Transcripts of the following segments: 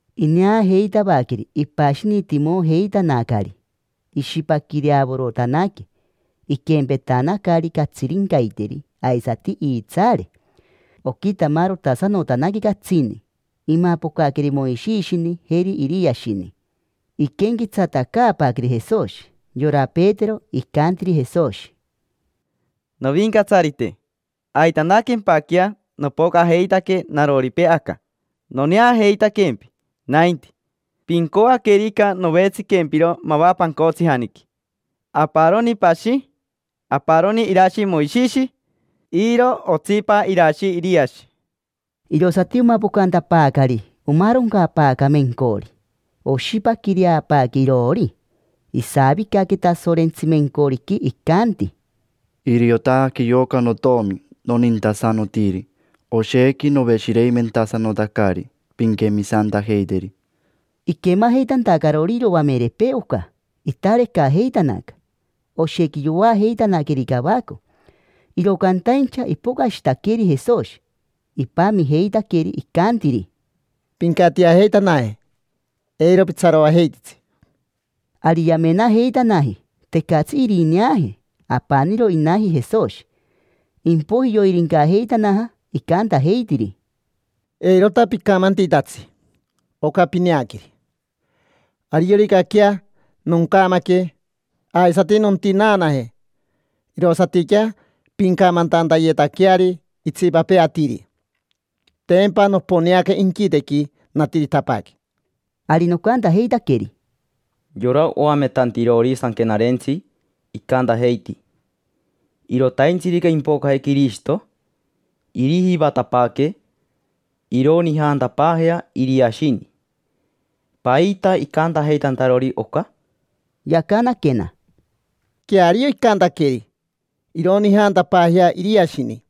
Ineajeitavaqueri ipashinitimojeitanacari. Ishipaquireavorotanaque, iquempetanacari catsirincaiteri; aisati iitsaare, oquitamarotasanotanaque catsini. Imapocaqueri Moishishini, jeri Iriashini: iquenquetsatacaapaaqueri Jesoshi. Yora Petero, icantiri Jesoshi: —Novincatsarite, aitanaquempaquea nopocajeitaque naroripee aca, noneajeitaquempi nainti. Pincoaquerica, novetsiquempiro mava pancotsijaniqui: aparoni pashi, aparoni irashi Moishishi, iro otsipa irashi Iriashi. Irosati omapocantapaacari omaaroncapaaca mencori, oshipaquireapaaque iroori. Isavicaque Tasorentsi mencoriqui, icanti: —Iriotaque yoca notomi nonintasanotiri, oshequi noveshireimentasanotacari. Pinquemisantajeiteri. Iquemajeitantacarori iroamerepee oca, itarecajeitanaca, oshequi yoajeitanaqueri cavaco. Iro cantaincha ipocashitaqueri Jesoshi, ipamijeitaqueri. Icantiri: —Pincatiajeitanaje, eiro pitsaroajeititsi. Ari yamenajeitanaji: tecatsi irineaje, apaniro inaji Jesoshi. Impoiji yoirincajeitanaja, icantajeitiri: —Eirota picamantitatsi oca pineaqueri. Arioricaquea noncamaque aisati nontinaanaje, irosatiquea pincamantantayetaqueari itsipapee atiri. Tempa noponeaca inquitequi, natiritapaaque. Ari nocantajeitaqueri: —Yora oametantirori Sanquenarentsi icantajeiti: “Irotaintsirica impoque Quirishito, irijivatapaaque ironijantapaajea Iriashini”. ¿Paita icantajeitantarori oca? Yacanaquena: —Queario icantaqueri: “Ironijantapaajea Iriashini,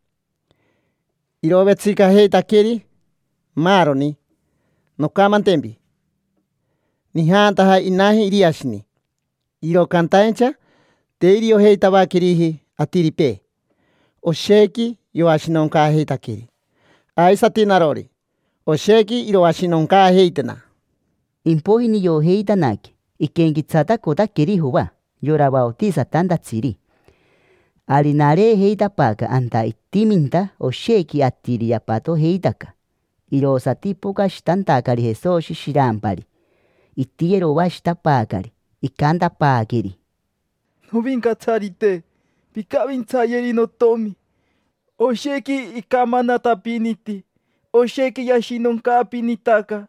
irovetsicajeitaqueri maaroni”. Noncamantempi: nijantaja inaji Iriashini, iro cantaincha te iriojeitavaqueriji atiripee, oshequi yoashinoncaajeitaqueri. Aisati narori, oshequi iroashinoncaajeitena. Impoiji niojeitanaque iquenquetsatacotaqueri Joa, yora vaotisatantatsiri. Ari nareejeitapaaca anta itiminta oshequi atiri yapatojeitaca. Irosati ipocashitantacari Jesoshi shirampari. Itiyeroashitapaacari, icantapaaqueri: —Novincatsarite, pincavintsayeri notomi: oshequi icamanatapiniti, oshequi yashinoncaapinitaca.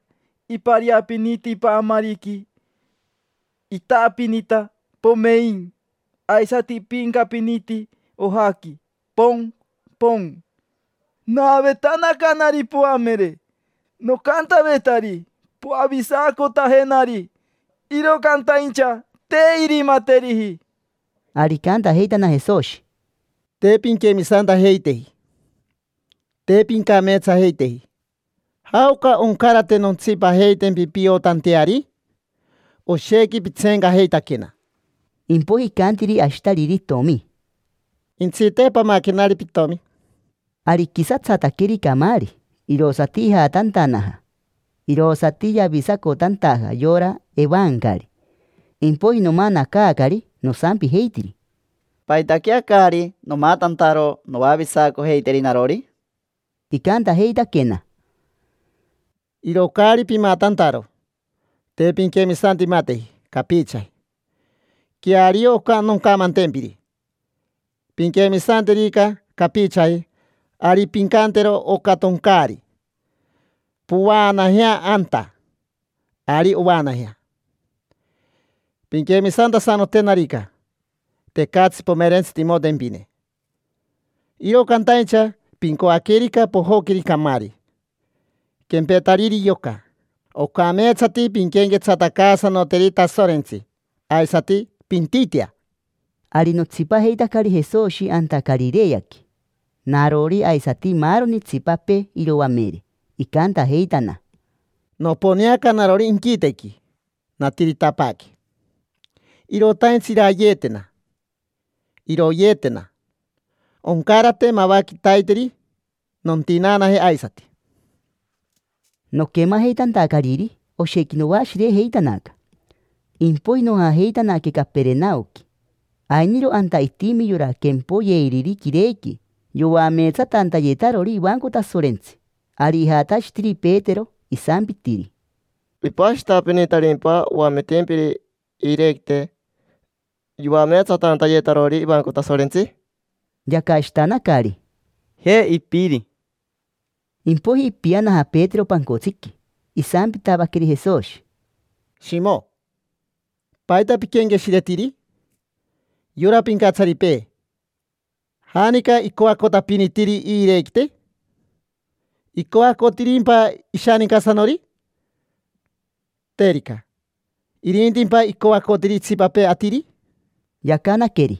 Ipariapiniti paamariqui, itaapinita, pomein: aisati ipiincapiniti ojaqui, pocn, pocn. Naavetanacanari poamere, nocantavetari: “Poavisacotajenari”, iro cantaincha te irimateriji. Ari icantajeitana Jesoshi: —Te pinquemisantajeiteji, te pincameetsajeiteji. ¿Jaoca oncarate nontsipajeitempi piotanteari? Oshequi pitseencajeitaquena. Impoiji icantiri ashitariri itomi: —Jentsite, pamaquenari pitomi. Ari iquisatsataqueri camaari, irosati ijatantanaja. Irosati yavisacotantaja yora evancari. Impoiji nomanacaacari nosampijeitiri: —¿Paitaquea caari nomatantaro noavisacojeiteri narori? Icantajeitaquena: —Iro caari pimatantaro te pinquemisantimateji capichaji. Queario oca noncamantempiri: pinquemisanterica capichaji ari pincantero oca toncaari: “Povaanajea anta”, ari ovaanajea. Pinquemisantasanoterica, tecatsi pomerentsitimotempine. Iro cantaincha pincoaquerica pojoqueri camaari quempetariri yoca, ocameetsati pinquenquetsatacaasanoteri Tasorentsi aisati pintitea. Ari notsipajeitacari Jesoshi anta Carireaqui: narori aisati maaroni itsipapee iroamere. Icantajeitana: —Noponeaca narori inquitequi, natiritapaaque. Irotaintsi irayeetena, iroyeetena. Oncarate mava quitaiteri nontinaanaje aisati. Noquemajeitantacariri, oshequi noashirejeitanaca. Impoiji nojajeitanaque Caperenaoqui. Ainiro anta itimi yora quempoyeiriri quirequi yoameetsatantayetarori ivanco Tasorentsi. Ari ijatashitiri Petero, isampitiri: —¿Ipashitapinitarimpa oametimpiri iirequite, yoameetsatantayetarori ivanco Tasorentsi? Yacashitanacari: —Je, ipiri. Impoiji ipianaja Petero pancotsiqui. Isampitavaqueri Jesoshi: —Shimo, ¿paita piquenqueshiretiri? Yora pincatsaripee, ¿janica icoacotapinitiri iirequite? ¿Icoacotirimpa ishanincasanori? Terica, ¿irintimpa icoacotiri itsipapee atiri? Yacanaqueri: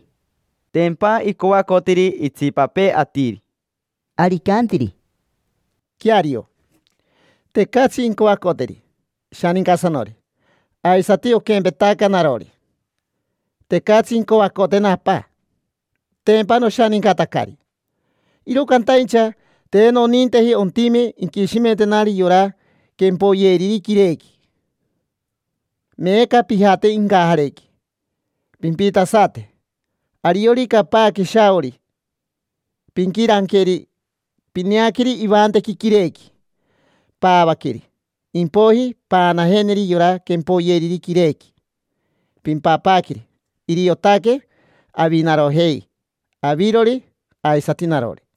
—Tempa icoacotiri itsipapee atiri. Ari icantiri: —Queario, tecatsi incoacoteri ishanincasanori. Aisati oquempetaca narori, tecatsi incoacotena Apa: tempa noshanincatacari. Iro cantaincha te noninteji ontime inquishimentenari yora quempoyeiriri quirequi. Meeca pijate incajarequi, pimpitasate. Ariorica paaque shaori, pinquirancaqueri, pineaqueri ivantequi quirequi. Paavaqueri, impoiji paanajeneri yora quempoyeiriri quirequi, pimpapaaqueri. Iriotaque avinarojei, avirori aisati narori.